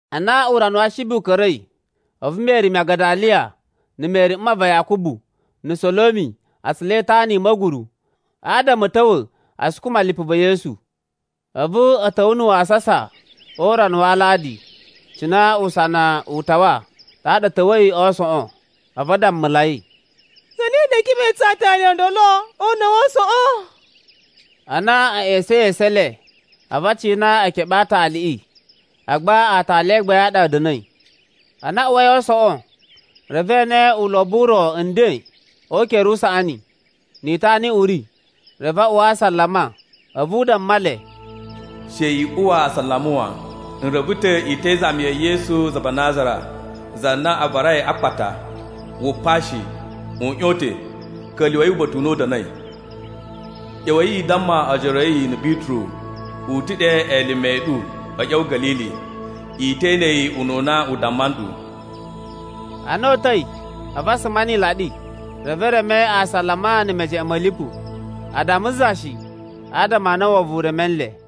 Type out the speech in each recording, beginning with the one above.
Ana urana wa Ashibi u ka̱ra̱i, a̱vu Meri Magadaliya na̱ Meri mma va Yakubu na̱ Solomi a tsula itana i ma̱guru, adama a̱ ta̱wa̱ a sukuma lipu va̱ Yesu. A̱vu a̱ ta̱wa̱ na̱ wasasa o urana wa Aladi, cina usana u tawa ɗaɗa a̱ ta̱wa̱i a aasoꞌon. A̱vu a dammulai, “Zane ɗa ee keɓe tsu aatali o ndolo o una̱ wa aasoꞌon?” Ana a̱ ꞌya̱sa̱in esu e le, a̱vu a cina e keɓe ɗe aataliꞌi agba aatali a gbain a ɗa a̱ da̱na̱i. Ana a uwai a aasoꞌon, reve e ene ulobo u ro nden o ukere usaꞌani, ni itana i uꞌuri. Reve a uwa asalama. A̱vu u damma le, “She i uwa asalama wan. N reve ta̱ i te izami ya̱ Yesu za va Nazara, za na a varai a akpata. Wu pa shi. U ꞌyon ta̱. Ka̱lyuwa̱i uba̱ta̱ u na u da̱na̱i. ꞌYa̱wa̱i i damma ojoro a̱ yi na̱ Bituru u ta̱ ɗe elime a̱ ɗu a̱ ꞌya̱wa̱ Ga̱lili. I te ene yi ununa u damma nɗu.” Ana o uta̱i, a̱vu a suma ni ilaɗi. Reve e reme asalama na̱ mejeꞌen ma̱ lipu. A damma za shi, adama a na wovon u reme nle.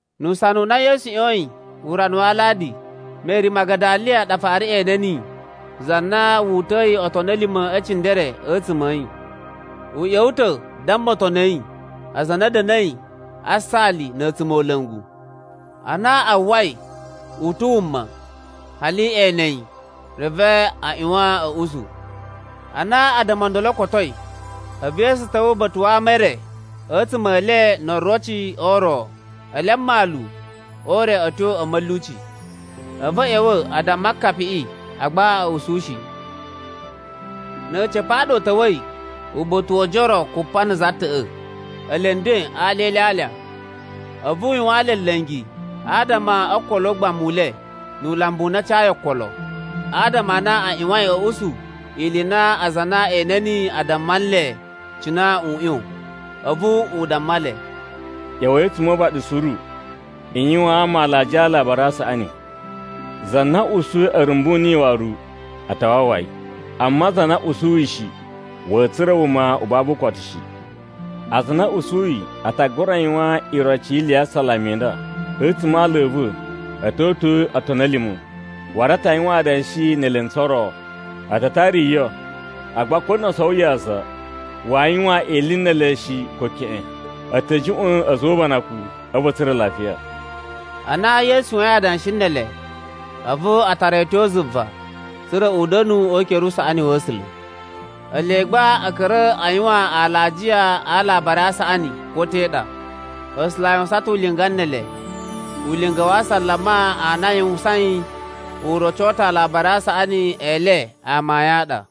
[Nu usana u na Yesu ꞌyoyin o urana wa Aladi, Meri Magadaliya ɗa fara ene niyi, za na wu uta̱yi otoni a̱ lima̱ e cindere a̱tsuma̱ a̱ yi. U ꞌya̱wa̱ ta̱ damma otoni a̱ yi, aza a na a̱ da̱na̱i a saali na̱ a̱tsumola̱ngu. Ana a uwwai u ta̱ wuma, hali we ene yi, reve a ꞌyuwan a̱ usu. Ana addama o ndolo o kotoi, a̱vu Yesu ta̱wa̱ uba̱ta̱ wa ama e re a̱tsuma̱ e le no oroci o ro, ele a mmalu o ure a̱ tyo a̱ ma̱lyuci. A̱vu a̱ ꞌya̱wa̱ a damma akapiꞌi, agba a̱ usu shi. Na̱ a̱ca̱pa̱ a ɗa u ta̱wa̱i uba̱ta̱ wo ojoro kupa na̱ za ta̱ꞌa̱, ele nden a alya e ilyalya. A̱vu u yuwaan le nla̱ngi adama o okolo o ugbamu u le nu ulambu u na a cayi okolo. Adama a na a ꞌyuwain a̱ usu ili i na aza a na e ene niyi a damma nle cina u ꞌyon. A̱vu u damma le, “ꞌYa̱wa̱i a̱tsuma̱ o uvaɗi suru i yuwaan ama alajiya a Alabari a Saꞌani. Za na usuyi a̱ rumbu niyi waru, a ta wawa yi. Amma za na usuyi shi, wa̱a̱ tsura̱ wuma u babu ukotu shi. Aza a na a̱ usuyi a ta gura yuwan iroci yi ili ya asalama i nda: A̱tsuma̱ a ala a̱ va̱ a̱ to uta̱a̱ otoni a̱ lima̱, waru a ta yuwan adanshi ne elentsu o ro, a ta tara yo, agba ko no o sowo yaza, waa yuwan ili ne ele shi ko keꞌen, a̱ ta̱ juꞌwa̱n a̱za̱ o ubanakun a̱vu a̱ tsura̱ lafiya.” Ana Yesu yuwain adanshi ne ele, a̱vu a tara yi a̱ tyo zuva, tsa̱ra̱ u da̱nu o ukere usaꞌani wa̱ A̱sula̱. Ele gba a̱ ka̱ra̱ a yuwan alajiya a Alabari a Saꞌani ko te ɗa, A̱sula̱ a yuwusan ulinga ne ele. Ulinga wa asalama a na a yuwusain, u roco ta̱ Alabari a Saꞌani e le amayun a ɗa.]